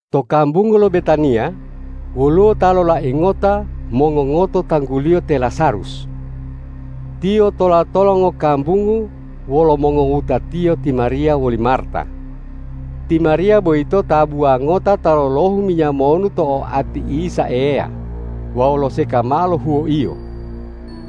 To kambungu lo Betaniya woluwo ta lolai ngota mongongoto tangguliyo te Lazarus. Tiyo tola-tola ngokambungu wolo mongowutatiyo ti Mariya woli Marta. Ti Mariya boyito tabuwa ngota ta lolohu minya monu to oati Isa Eya wawu loseka mao lo huwoiyo.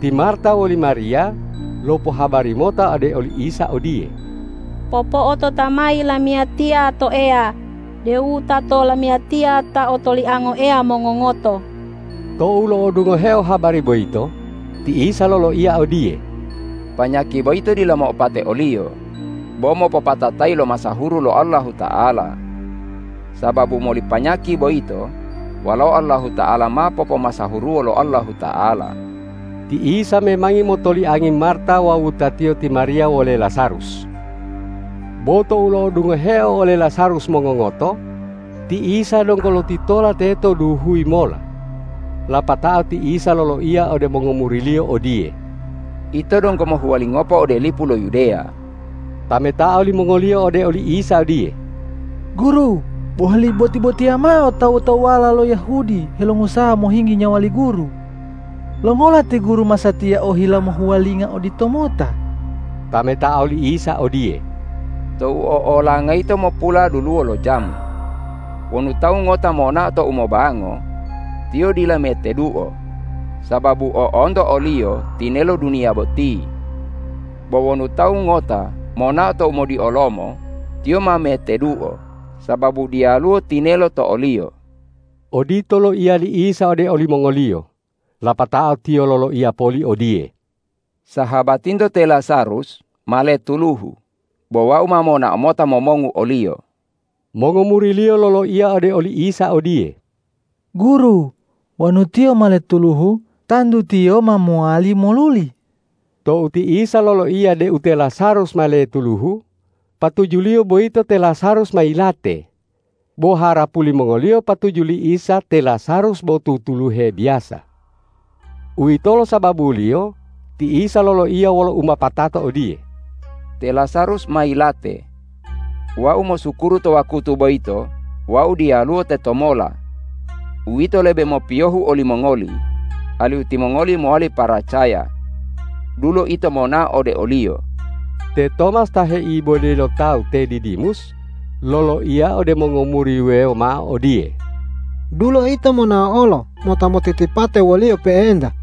Ti Marta woli Mariya lopohabari mota ode oli Isa odiye,”Popo'ota mayi lamiyatiya to Eya deu wutato lamiyatiya ta otoliango Eya mongongoto.” Tou lo'odungoheo habari boyito, ti Isa loloiya odiye,”Panyaki boyito dila mo'opate oliyo, bo mopopatatayi lo masahuru lo Allahuta'ala. Sababu moli panyaki boyito, Walao Allahuta'ala ma popomasahuruwo lo Allahuta'ala.” Ti Isa memangi motoliangi Marta wawu wutatiyo ti Mariya wole Lazarus. Bo tou lo'odungoheo ole Lazarus mongongoto, ti Isa donggo lotitola teto duhuyi mola. Lapatao ti Isa loloiya ode mongomuri-Liyo odiye,”Ito donggo mohuwalingopo ode lipu lo Yudeya.” Tametao limongoliyo ode li Isa odiye,”Guru, boheli boti-botiya mao tawu-tawuwala lo Yahudi helongusaha mohinggi nyawa li Guru. Longola ti Guru masatiya ohila mohuwalinga oditomota?” Tametao li Isa odiye,”Tou o'olanga yito mopuladuluwo lo jamu. Wonu tawu ngota monao tou mobango, tiyo dila meteduo, sababu o'onto oliyo tinelo duniya boti. Bo wonu tawu ngota monao tou modiolomo, tiyo ma meteduo, sababu diyaluwo tinelo to oliyo.” Odito loiya li Isa ode olimongoliyo, lapatao Tiyo loloiya poli odiye,”Sahabatinto te Lazarus ma letuluhu, bo Wau ma monao mota momongu oliyo.” Mongomuri-Liyo loloiya ode oli Isa odiye,”Guru, wonu tiyo ma letuluhu, tantu tiyo ma mowali moluli.” Tou ti Isa loloiya deu te Lazarus ma letuluhu, patuju-Liyo boyito te Lazarus ma yilate, bo harapu limongoliyo patuju li Isa te Lazarus bo tutuluhe biyasa. Uwitolo sababuliyo ti Isa loloiya wolo umopatato odiye,”Te Lazarus ma yilate. Wau mosukuru to wakutu boyito Wau diyaluwo tetomola. Uwito lebe mopiyohu olimongoli alihu timongoli mowali paracaya. Dulo ito monao ode oliyo.” Te Tomas ta heibode lo tawu te Didimus loloiya ode mongomuri wuwewo mao odiye,”Dulo ito monao olo, mota motitipate wo-Liyo pe'enta.”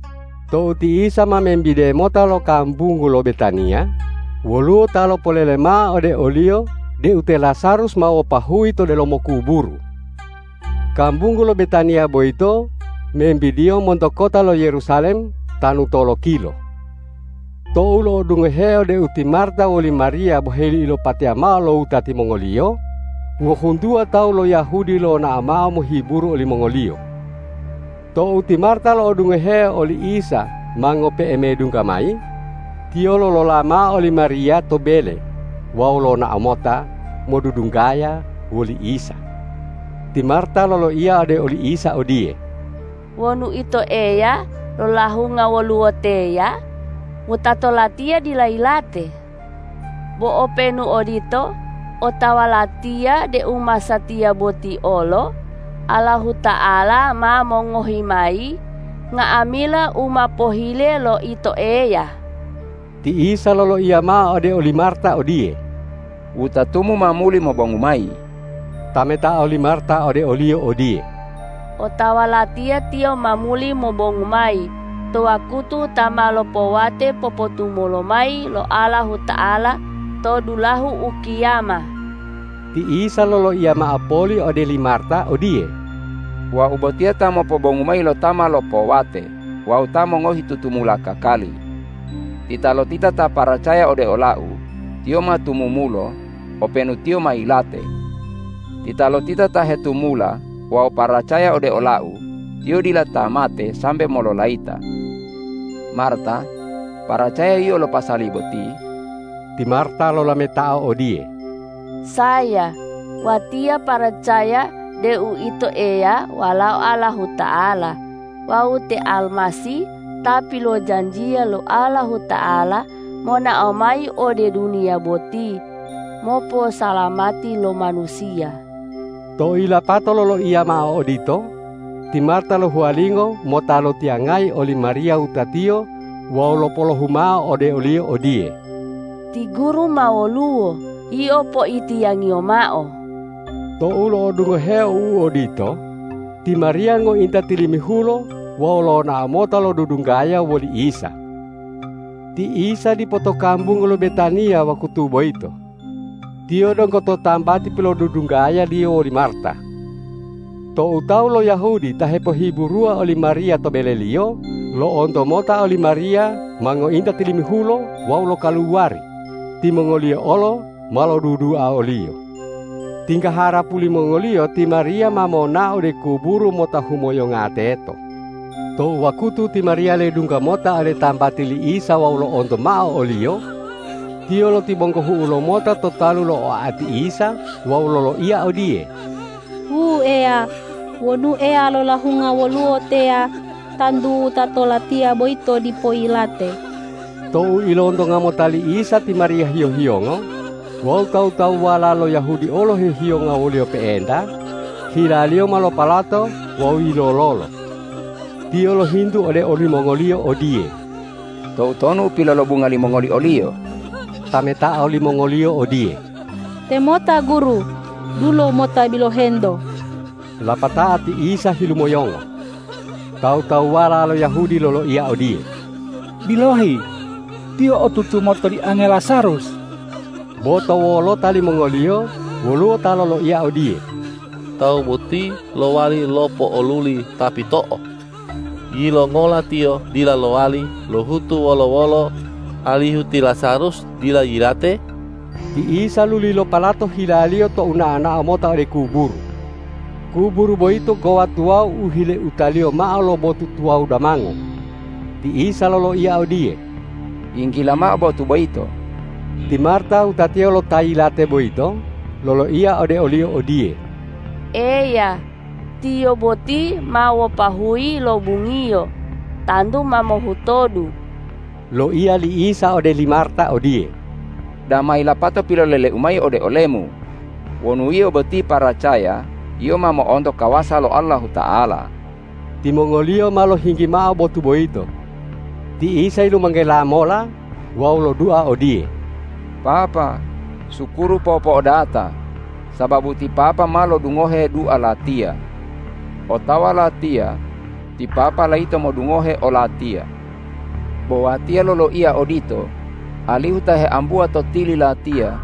Tou ti Isa ma membide mota lo kambungu lo Betaniya, woluwo ta lopolele mao ode o-Liyo deu te Lazarus ma wapahuyi to delomo kuburu. Kambungu lo Betaniya boyito wembidiyo monto kota lo Yerusalem tanu tolokilo. Tou lo'odungoheo deu ti Marta woli Mariya boheli ilopateya mao lo wutati mongoliyo, ngohuntuwa tawu lo Yahudi lonao mao mohiburu olimongoliyo. Tou ti Marta lo'odungoheo oli Isa ma ngope'e medungga mayi, tiyo lolola mao oli Mariya to bele wawu lonao mota modudunggaya woli Isa. Ti Marta loloiya ode oli Isa odiye,”Wonu Ito Eya lolahunga woluwo teya, wutato latiya dila yilate. Bo openu odito, otawa latiya deu masatiya boti olo Allahuta'ala ma mongohi mayi nga'amila u ma pohile lo Ito Eya.” Ti Isa loloiya mao ode oli Marta odiye,”Wutatumu ma muli mobongu mayi.” Tametao li Marta ode o-Liyo odiye,”Otawa latiya tiyo ma muli mobongu mayi to wakutu ta ma lopowate popotumulo mayi lo Allahuta'ala to dulahu ukiyama.” Ti Isa loloiya mao poli ode li Marta odiye,”Wau botiya ta mopobongu mayi lo ta ma lopowate wawu ta mongohi tutumula kakali. Titalotita ta paracaya ode ola-U, tiyo ma tumumulo openu tiyo ma yilate. Titalotita ta hetumula wawu paracaya ode ola-U, tiyo dila ta mate sambe mololayita. Marta, paracaya yio lo pasali boti?” Ti Marta lolametao odiye,”Saya, watiya paracaya deu Ito Eya Walao Allahuta'ala wawu te Almasih ta pilojanjiya lo Allahuta'ala monao mayi ode duniya boti moposalamati lo manusiya.” Tou yilapato loloiya mao odito, ti Marta lohuwalingo mota lotiyangayi oli Mariya wutatiyo wawu lopolohumao ode oliyo odiye,”Ti Guru ma woluwo yio poitiyangiyo mao.” Tou lo'odungoheo u odito, ti Mariya ngointa tilimihulo wawu lonao mota lodudunggaya woli Isa. Ti Isa dipo to kambungu lo Betaniya wakutu boyito. Tiyo donggo to tambati pilodudunggaya-Liyo woli Marta. Tou tawu lo Yahudi ta hepohiburuwa oli Mariya to beleliyo, lo'onto mota oli Mariya ma ngointa tilimihulo wawu lokaluwari, timongoliyo olo ma lodudua oliyo. Tingga harapu limongoliyo ti Mariya ma monao ode kuburu mota humoyonga teto. To wakutu ti Mariya ledungga mota ode tambati li Isa wawu lo'onto mao o-Liyo, tiyo lotibonggohu'u lomota to talu lo oati Isa wawu loloiya odiye,”Wu Eya, wonu Eya lolahunga woluwo teya, tantu wutato latiya boyito dipo yilate.” Tou ilontonga mota li Isa ti Mariya hiyo-hiyongo wawu tawu-tawuwala lo Yahudi olo hehiyonga woliyo pe'enta, hila-Liyo ma lopalato wawu yilololo. Tiyo lohintu ode olimongoliyo odiye,”Toutonu u pilolobunga limongoli oliyo?” Tametao limongoliyo odiye,”Temota Guru, dulo mota bilohento.” Lapatao ti Isa hilumoyongo. Tawu-tawuwala lo Yahudi loloiya odiye,”Bilohi, Tiyo otutu motoliange Lazarus!” Bo to wolota limongoliyo woluwo ta loloiya odiye,”Tawu boti lowali lopo'oluli ta pito'o. Yilongola Tiyo dila lowali lohutu wolo-wolo alihu te Lazarus dila yilate?” Ti Isa luli lopalato hila-Liyo tou nao-nao mota ode kuburu. Kuburu boyito gowa tuwawu u hileutaliyo mao lo botu tuwawu damango. Ti Isa loloiya odiye,”Yinggila mao botu boyito!” Ti Marta wutatiyo lo ta yilate boyito loloiya ode o-Liyo odiye,”Eya, tiyo boti ma wapahuyi yilobungiyo, tantu ma mohutodu!” Loiya li Isa ode li Marta odiye,”Dama yilapato pilolele-U mayi ode olemu, wonu yio boti paracaya, yio ma mo'onto kawasa lo Allahuta'ala?” Timongoliyo ma lohinggi mao botu boyito. Ti Isa yilumanggela mola wawu lodua odiye,”Papa, sukuru po'o-po'odata sababu ti Papa ma lodungohe dua Latiya. Otawa Latiya ti Papa layito modungohe o-Latiya. Bo Watiya loloiya odito alihu ta heambuwa to tili Latiya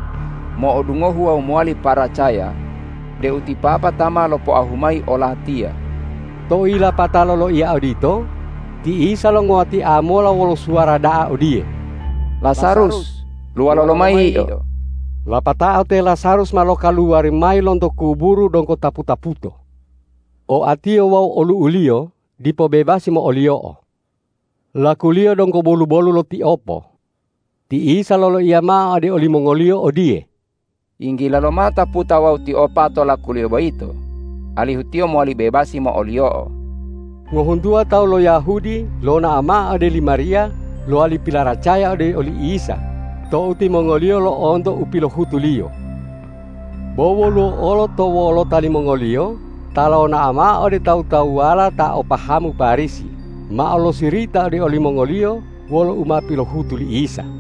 mo'odungohu wawu mowali paracaya deu ti Papa ta ma lopoahu mayi o-Latiya.” Tou yilapata loloiya odito, ti Isa longuwatia mola wolo suwara da'a odiye,”Lazarus, luwalo lomayi yio!” Lapatao te Lazarus ma lokaluwari mayi lonto kuburu donggo tapu-taputo. Oatiyo wawu olu'uliyo dipo bebasi mo'oliyo'o. Lakuliyo donggo bolu-bolu lo tiopo. Ti Isa loloiya mao ode olimongoliyo odiye,”Yinggila lomao taputa wawu tiopa to lakuliyo boyito, alihu tiyo mowali bebasi mo'oliyo'o.” Ngohuntuwa tawu lo Yahudi lonao mao ode li Mariya lowali pilaracaya ode oli Isa tou timongoliyo lo'onto u pilohutu-Liyo. Bo woluwo olo to wolota limongoliyo ta lonao mao ode tawu-tawuwala ta o pahamu Parisi mao losirita ode olimongoliyo wolo u ma pilohutu li Isa.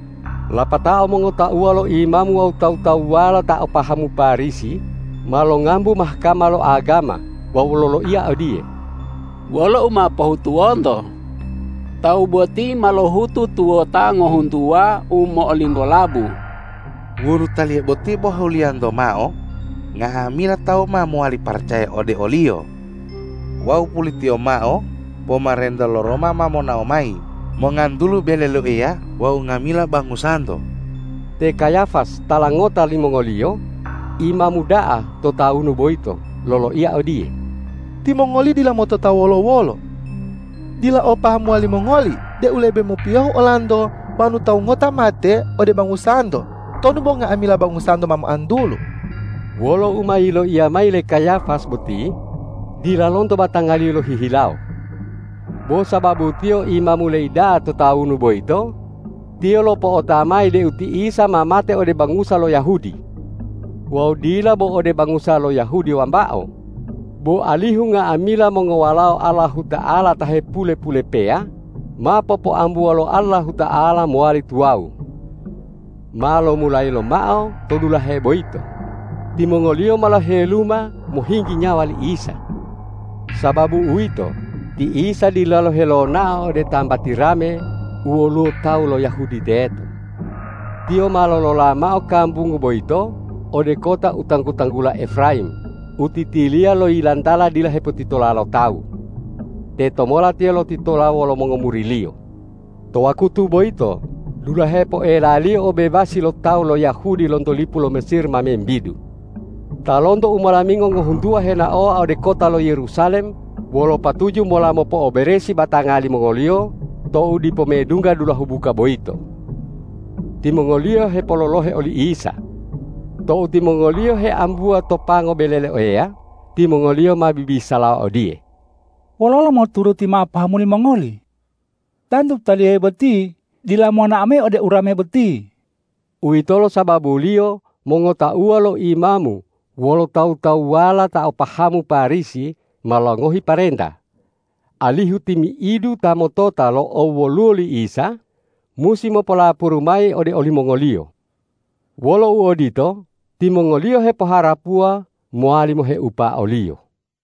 Lapatao mongotauwa lo imamu wawu tawu-tawuwala ta o pahamu Parisi ma longambu Mahkama lo agama wawu loloiya odiye,”Wolo u ma pohutuwonto? Tawu boti ma lohutu tuwota ngohuntuwa u mo'olinggolabu! Wonu Taliye boti bo huliyanto mao, nga'amila tawu ma mowali paracaya ode o-Liyo. Wawu pulitiyo mao pomarenta lo Roma ma monao mayi mongantulu bele lo Eya wawu nga'amila bangusanto.” Te Kayafas tala ngota limongoliyo, imamu da'a to tawunu boyito loloiya odiye,”Timongoli dila motota wolo-wolo. Dila opahamuwa limongoli deu lebe mopiyohu olanto wonu tawu ngota mate ode bangusanto tonu bo nga'amila bangusanto ma moantulu.” Wolo u ma yiloiya mayi le Kayafas boti dila lonto batangaliyo lohihilawo. Bo sababu tiyo imamu leida'a to tawunu boyito, tiyo lopo'ota mayi deu ti Isa ma mate ode bangusa lo Yahudi, wawu dila bo ode bangusa lo Yahudi wambao, bo alihu nga'amila mongowalao Allahuta'ala ta hepule-pulepeya, ma popoambuwo lo Allahuta'ala mowali tuwawu. Ma lomulayi lomao to dulahe boyito, timongoliyo ma loheluma mohinggi nyawa li Isa. Sababu uwito, ti Isa dilalo helonao ode tambati rame u woluwo tawu lo Yahudi teto. Tiyo ma lolola mao kambungu boyito ode kota u tanggu-tanggula Efrayim u titiliya lo yilantala dila hepotitola lo tawu. Tetomola Tiyo lotitola wolo mongomuri-Liyo. To wakutu boyito dulahe poelaliyo obebasi lo tawu lo Yahudi lonto lipu lo Mesir ma membidu. Ta lonto umolamingo ngohuntuwa henaowa ode kota lo Yerusalem wolo patuju mola mopo'oberesi batanga limongoliyo tou dipo medungga dulahu buka boyito. Timongoliyo hepololohe oli Isa. Tou timongoliyo heambuwa to pango bele lo Eya, timongoliyo ma bibisalawa odiye,”Wololo moturuti mao pahamu limongoli? Tantu Taliye boti dila monao mayi ode urame boti.” Uwitolo sababuliyo mongotauwa lo imamu wolo tawu-tawuwala ta o pahamu Parisi ma longohi parenta, alihu timi'idu ta motota lo owoluwo li Isa, musi mopolapuru mayi ode olimongoliyo. Wolo uodito, timongoliyo hepoharapuwa mowali moheupa o-Liyo.